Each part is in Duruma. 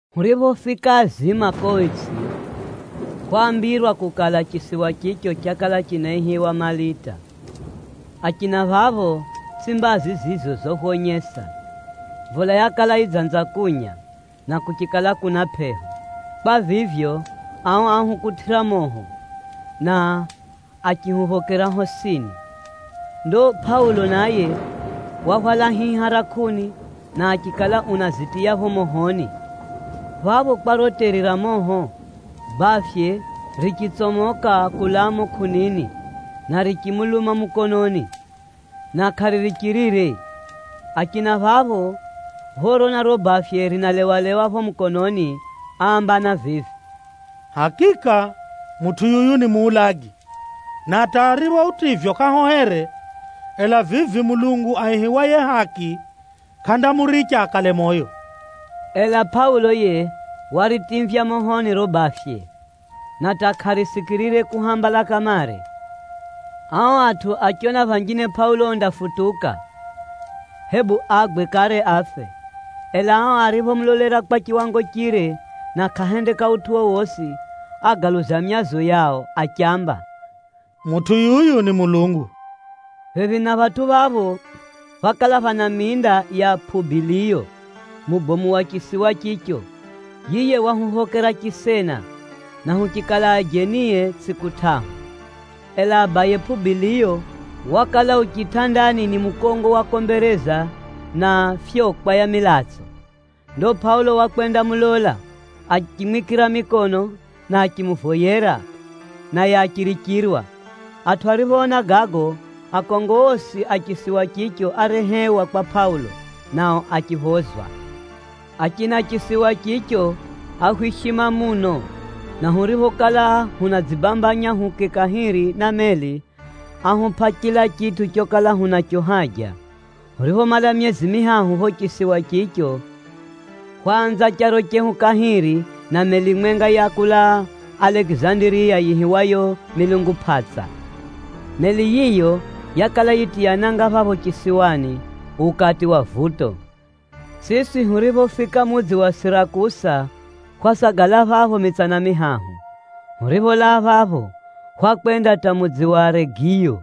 Huriphofika azima ko itsʼi, hwaambirwa kukala, chisiwa chicho chakala chinaihiwa Malita. Achina phapho, tsʼi mbazi zizo zohwonyesa. Mvula yakala yidzanza kunya, na kuchikala kuna pʼeho. Kwa vivyo, ao áhukutʼira moho, na achihuphokera hosini. Ndo Pʼaulo naye wahwala hiha ra kʼuni, na achikala unazitiya pho mohoni. Phapho kwa riro teri ra moho, bafye richitsomoka kulaa mumo kʼunini, na richimuluma mukononi, na kʼaririchirire. Achina phapho phorona riro bafye rinalewalewa pho mukononi, áambana vivi, “Hakika mutʼu yuyu ni muulagi, na hata aripho utivywa kʼahohere, ela vivi mulungu aihiwaye Haki, kʼandamuricha akale moyo.” Ela Pʼaulo yiye waritimvya mohoni riro bafye, na hata kʼarisikirire kuhambala kamare. Ao atʼu achiona phanjine Pʼaulo undafutuka, hebu agwe kare afe. Ela ao ariphomulolera kwa chiwango chire na kʼahendeka utʼu wowosi, ágaluza myazo yao achiamba, “Mutʼu yuyu ni mulungu.” Phephi na phatʼu phapho, phákala phana minda ya Pʼubiliyo, mubomu wa chisiwa chicho. Yiye wahuphokera chisena, na huchikala ajenie tsʼiku tʼahu. Ela abaye Pʼubiliyo wakala u chitʼandani ni mukongo wa kombereza na fyokwa ya milatso. Ndo Pʼaulo wakwendamulola, achimwikira mikono na achimuvoyera, naye achirichirwa. Atʼu ariphoona gago, akongo osi a chisiwa chicho árehewa kwa Pʼaulo, nao achiphozwa. Achina chisiwa chicho áhwishima muno, na huriphokala hunadzibambanya huuke kahiri na meli, áhupʼa chila chitʼu chokala hunacho haja. Huriphomala myezi mihahu pho chisiwa chicho, hwaanza charo chehu kahiri na meli mwenga ya kulaa Alekizandiriya yiihiwayo, “Milungu Pʼatsa.” Meli yiyo yakala yitiya nanga phapho chisiwani ukati wa vuto. Siswi huriphofika mudzi wa Sirakusa, hwasagala phapho mitsana mihahu. Huripholaa phapho, hwakwenda hata mudzi wa Regiyo.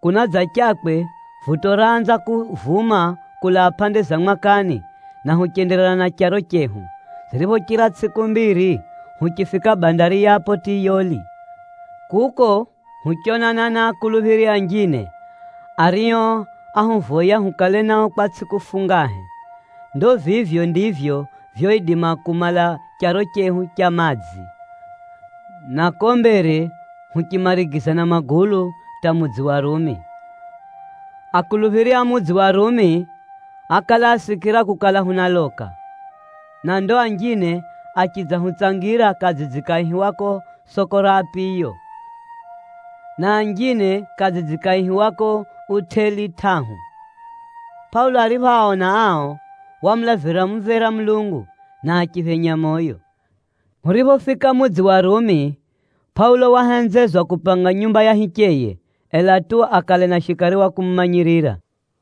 Kunadzachakwe, vuto raanza kuvuma kulaa pʼande za mwakani, na huchenderera na charo chehu. Ziriphochira tsʼiku mbiri, huchifika bandari ya Pʼotiyoli. Kuko huchonana na akuluphiri anjine, ario áhuvoya hukale nao kwa tsʼiku fungahe. Ndo vivyo ndivyo vyoidima kumala charo chehu cha madzi, na ko mbere huchimarigiza na magulu hata mudzi wa Rumi. Akuluphiri a mudzi wa Rumi ákala asikira kukala hunaloka, na ndo anjine achidzahutsangira kadzidzi kaihiwako Soko ra Apiyo, na anjine kadzidzi kaihiwako Utʼeli Tʼahu. Pʼaulo ariphoaona ao, wamulavira mumvera Mulungu, na achiphenya moyo. Huriphofika mudzi wa Rumi, Pʼaulo wahenzezwa kupanga nyumba ya hicheye, ela tu akale na shikari wa kumumanyirira.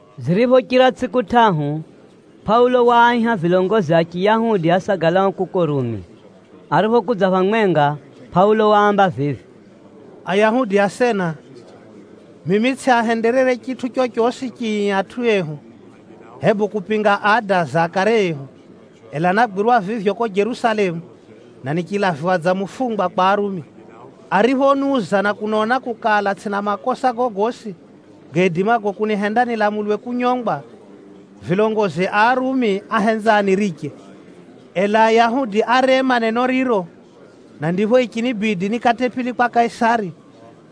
Ziriphochira tsʼiku tʼahu, Pʼaulo waaiha vilongozi a Chiyahudi asagalao kuko Rumi. Ariphokudza phamwenga, Pʼaulo waamba vivi, “Ayahudi asena, mimi tsʼiahenderere chitʼu chochosi chii atʼu ehu, hebu kupinga ada za akare ehu, ela nágwirwa vivyo ko Jerusalemu, na nichilaviwa dza mufungwa kwa Arumi. Ariphoniuza na kunona kukala, tsʼina makosa gogosi gaidimago kunihenda nilamulwe kunyongwa, vilongozi a Arumi áhenza aniriche. Ela Ayahudi árema neno riro, na ndipho yichinibidi nikatʼe pili kwa Kaisari,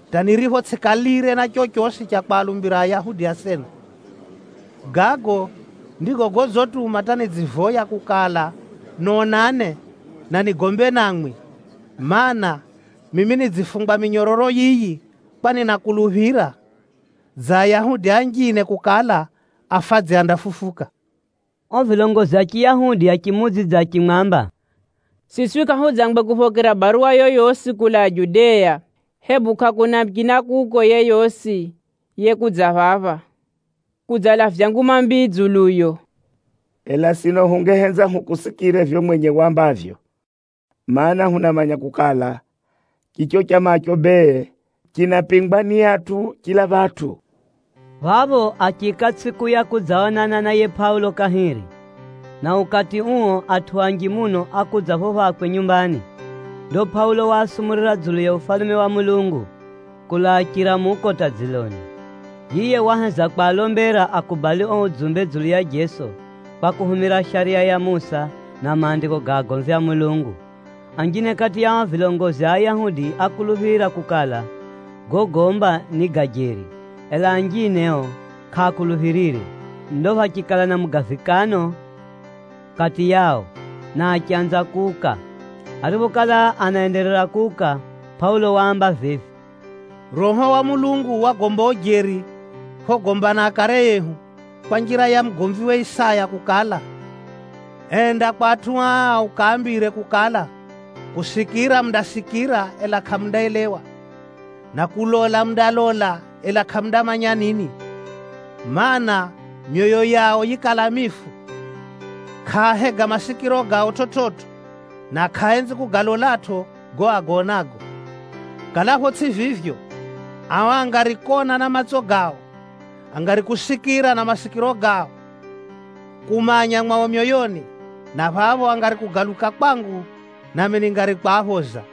hata niripho tsʼikalire na chochosi cha kwalumbira Ayahudi asena. Gago ndigo godzituma hata nidzivoya kukala nonane, na nigombe namwi, mana, mimi nidzifungwa minyororo yiyi kwa ninakuluphira dza Ayahudi anjine kukala, afadzi andafufuka.” O vilongozi a Chiyahudi achimuudzidza achimwamba, “Siswi kʼahudzangwe kuphokera baruwa yoyosi kulaa Judea, hebu kʼakuna muchina kuko yeyosi yekudza phapha, kudzalavya nguma mbii dzuluyo. Ela sino hungehenza hukusikire vivyo mwenye wambavyo. Maana, hunamanya kukala, chicho chamacho bee, chinapingwa ni atʼu chila phatʼu.” Phapho achiika tsʼiku ya kudzaonana na yiye Pʼaulo kahiri, na ukati uo atʼu anji muno ákudza pho phakwe nyumbani. Ndo Pʼaulo waasumurira dzulu ya Ufalume wa Mulungu, kulaa chiramuko hata dziloni. Yiye waheza kwalombera akubali o udzumbe dzulu ya Jeso, kwa kuhumira Shariya ya Musa na Maandiko ga agomvi a Mulungu. Anjine kati ya o vilongozi a Ayahudi ákuluphira kukala, gogomba ni ga jeri, ela anjine o kʼaakuluphirire. Ndo phachikala na mugavikano kati yao, na achanza kuuka. Ariphokala anaenderera kuuka, Pʼaulo waamba vivi, “Roho wa Mulungu wagomba ujeri phogomba na akare ehu, kwa njira ya mugomviwe Isaya kukala, ‘Enda kwa atʼu aa ukaambire kukala, “Kusikira mundasikira, ela kʼamundaelewa, na kulola mundalola, ela kʼamundamanya nini. Maana, myoyo yao yikala mifu, kʼaahega masikiro gao chividzo, na kʼaaenzi kugalolatʼo gago agaonago. Kalapho tsʼi vivyo, ao angari kona na matso gao, angari kusikira na masikiro gao, kumanya mwao myoyoni, na phapho angari kugaluka kwangu, nami ningari kwaphoza.”’”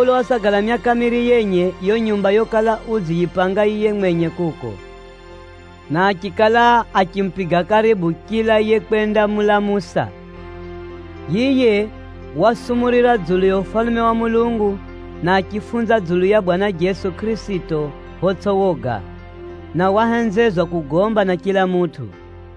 Pʼaulo wasagala myaka miiri yenye yo nyumba yokala udziyipanga yiye mwenye kuko, na achikala achimupiga karibu chila yekwendamulamusa. Yiye wasumurira dzulu ya Ufalume wa Mulungu, na achifunza dzulu ya Bwana Jeso Kʼirisito photsʼi woga, na wahenzezwa kugomba na chila mutʼu.